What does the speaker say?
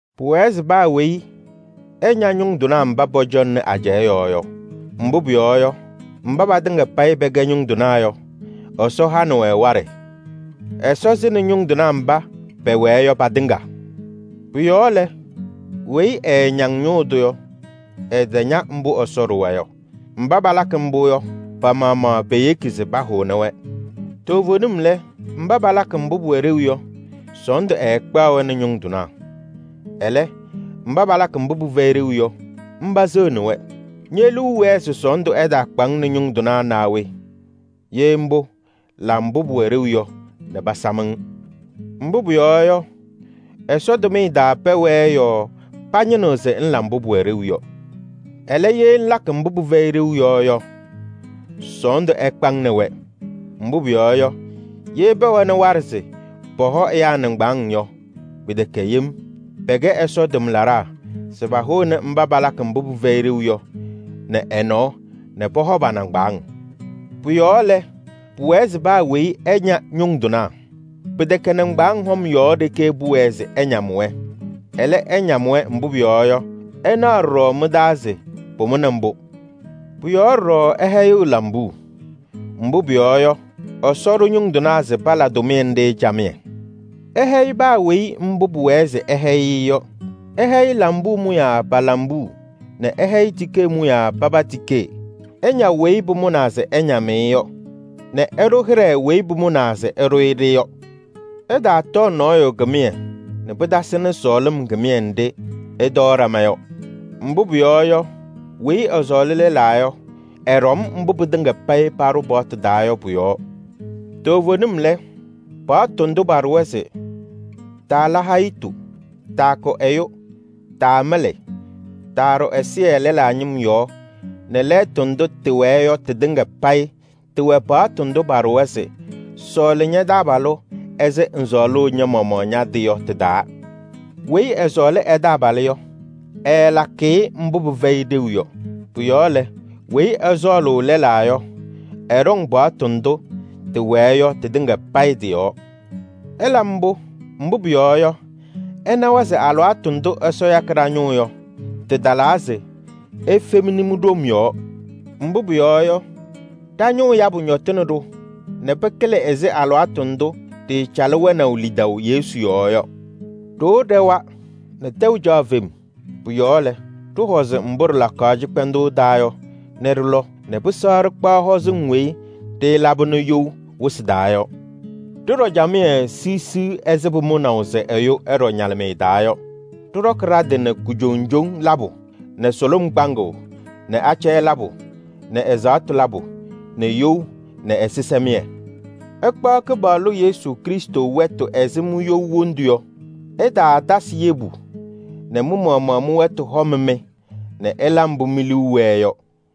Pʋwɛɛ se paa weyi ɛña ñʋŋ tɩnaa mba pɔcɔŋnɩ ajɛɛ yɔɔ yɔ. Mbʋ pʋyɔɔ yɔ, mba patɩŋa payɩ pɛkɛ ñʋŋ tɩnaa yɔ, Ɛsɔ hanɩ-wɛ waɖɛ. Ɛsɔ sɩnɩ ñʋŋ tɩnaa mba pɛwɛɛ yɔ patɩŋa. Pʋ-yɔɔ lɛ, weyi ɛɛñaŋ ñʋʋ tʋ yɔ, ɛtaña mbʋ Ɛsɔ ɖʋwa yɔ. Mba palakɩ mbʋ yɔ, pa-maɣmaɣ peyeki se pahʋnɩ-wɛ. Toovenim lɛ, mba palakɩ mbʋ pʋwɛ ɖeu yɔ, sɔɔndʋ ɛɛkpaɣ-wɛ nɛ ñʋŋ tɩnaa. Ɛlɛ, mba palakɩ mbʋ pɩfɛyɩ ɖeu yɔ, mba seɣni-wɛ. Ñe-liu wɛɛ se sɔɔndʋ ɛtaakpa-ŋ nɛ ñʋŋ tɩnaa naa we? Ye mbʋ, la mbʋ pʋwɛ ɖeu yɔ nɛ pasam-ŋ. Mbʋ pʋyɔɔ yɔ, Ɛsɔ tʋmɩyɛ taa pɛwɛɛ yɔɔ pañɩnɩɣ se ŋla mbʋ pʋwɛ ɖeu. Ɛlɛ, ye ŋlakɩ mbʋ pɩfɛyɩ ɖeu yɔ yɔ, sɔɔndʋ ɛkpa-ŋ nɛ wɛ. Mbʋ pʋyɔɔ yɔ, ye pɛwɛnɩ waɖɛ se pɔhɔ ɛyaa nɩŋgbaaŋ yɔ, pɩtɛkɛ yem: pɛkɛ Ɛsɔ tʋmlaɖaa se pahʋnɩ mba palakɩ mbʋ pɩfɛyɩ ɖeu yɔ nɛ ɛ-nɔɔ nɛ pɔhɔ pa-nɩŋgbaaŋ. Pʋ-yɔɔ lɛ, pʋwɛɛ se paa weyi ɛña ñʋŋ tɩnaa. Pɩtɛkɛ nɩŋgbaŋʋʋ hɔm yɔɔ ɖeke pʋwɛɛ se ɩñam-wɛ. Ɛlɛ, ɩñam-wɛ, mbʋ pʋyɔɔ yɔ, ɩnaɣ ɖɔɖɔ mɩ-taa se pʋmʋnɩ mbʋ. Pʋ-yɔɔ ɖɔɖɔ ɩhɛyɩɣ lambuu. Mbʋ pʋyɔɔ yɔ, Ɛsɔ ɖʋ ñʋŋ tɩnaa se pala tʋmɩyɛ nɖɩ camɩyɛ. Ɩhɛyɩ paa weyi mbʋ pʋwɛɛ se ɩhɛyɩ-ɩ yɔ. Ɩhɛyɩ lambuu mʋyaa pa-lambuu nɛ ɩhɛyɩ tikee mʋyaa paba tikee. Ɩña weyi pʋmʋnaa se ɩñam-ɩ yɔ nɛ ɩɖʋ hɩɖɛ weyi pʋmʋnaa se ɩɖʋ-ɩ-ɖɩ yɔ. Ɩtaatɔɔ nɔɔyʋ kɩmɩyɛ nɛ pɩtasɩnɩ sɔɔlɩm kɩmɩyɛ nɖɩ ɩtɔɔ ɖama yɔ. Mbʋ pʋyɔɔ yɔ, weyi ɛsɔɔlɩ lɛlaa yɔ, ɛɖɔm mbʋ pɩtɩŋa payɩ paɖʋ paɣtʋ taa yɔ pʋ-yɔɔ. Toovenim lɛ, paɣtʋ ndʋ paɖʋwa se: taala hayitu, taakʋ ɛyʋ, taamɩlɩ, taaɖʋ ɛzɩyɛ lɛlaa ñɩm yɔɔ nɛ lɛɛtʋ ndʋ tɩwɛɛ yɔ tɩtɩŋa payɩ tɩwɛ paɣtʋ ndʋ paɖʋwa se: sɔɔlɩ ña-taabalʋ ɛzɩ ŋsɔɔlʋʋ ña-maɣmaɣ ña-tɩ yɔ tɩ-taa. Weyi ɛsɔɔlɩ ɛ-taabalʋ yɔ, ɛɛlakɩ-ɩ mbʋ pɩfɛyɩ ɖeu yɔ. Pʋ-yɔɔ lɛ, weyi ɛsɔɔlʋʋ lɛlaa yɔ, ɛɖɔŋ paɣtʋ ndʋ tɩwɛɛ yɔ tɩtɩŋa payɩ tɩ-yɔɔ. Ɩla mbʋ, mbʋ pʋyɔɔ yɔ, ɩnawa se alɩwaatʋ ndʋ Ɛsɔ yakɩ ɖa-ñʋʋ yɔ, tɩtalaa se ifemni mi-ɖom yɔɔ. Mbʋ pʋyɔɔ yɔ, ɖa-ñʋʋ yabʋ ñɔtɩnɩ-ɖʋ nɛ pɩkɩlɩ ɛzɩ alɩwaatʋ ndʋ ɖɩɩcalɩ wɛnaʋ lidaʋ Yesu yɔɔ yɔ. Ɖoo ɖɛwa nɛ tɛʋ caɣ fem. Pʋ-yɔɔ lɛ, ɖɩhɔzɩ mbʋ ɖɩlakaɣ cɩkpɛndʋʋ taa yɔ nɛ ɖɩlɔ nɛ pɩsɛɣ ɖɩkpaɣ hɔzɩŋ weyi ɖɩɩlabɩnɩ you wɩsɩ taa yɔ. Ɖɩɖɔ camɩyɛ siɣsiɣ ɛzɩ pʋmʋnaʋ se ɛyʋ ɛɖɔ ñalɩmɩyɛ taa yɔ. Ɖɩɖɔkɩ ɖa-tɩ nɛ kujoŋjoŋ labʋ nɛ sʋlʋm kpaŋʋʋ nɛ acɛyɛ labʋ nɛ ɛzaɣtʋ labʋ nɛ you nɛ ɛzɩsɛmɩyɛ. Ɩkpaɣ Kɩpaɣlʋ Yesu Krɩstʋ wɛtʋ ɛzɩ mi-you wondu yɔ. Ɩtaatasɩ yebu nɛ mɩ-maɣmaɣ mɩ-wɛtʋ hɔm-mɩ nɛ ɩla mbʋ mi-liu wɛɛ yɔ.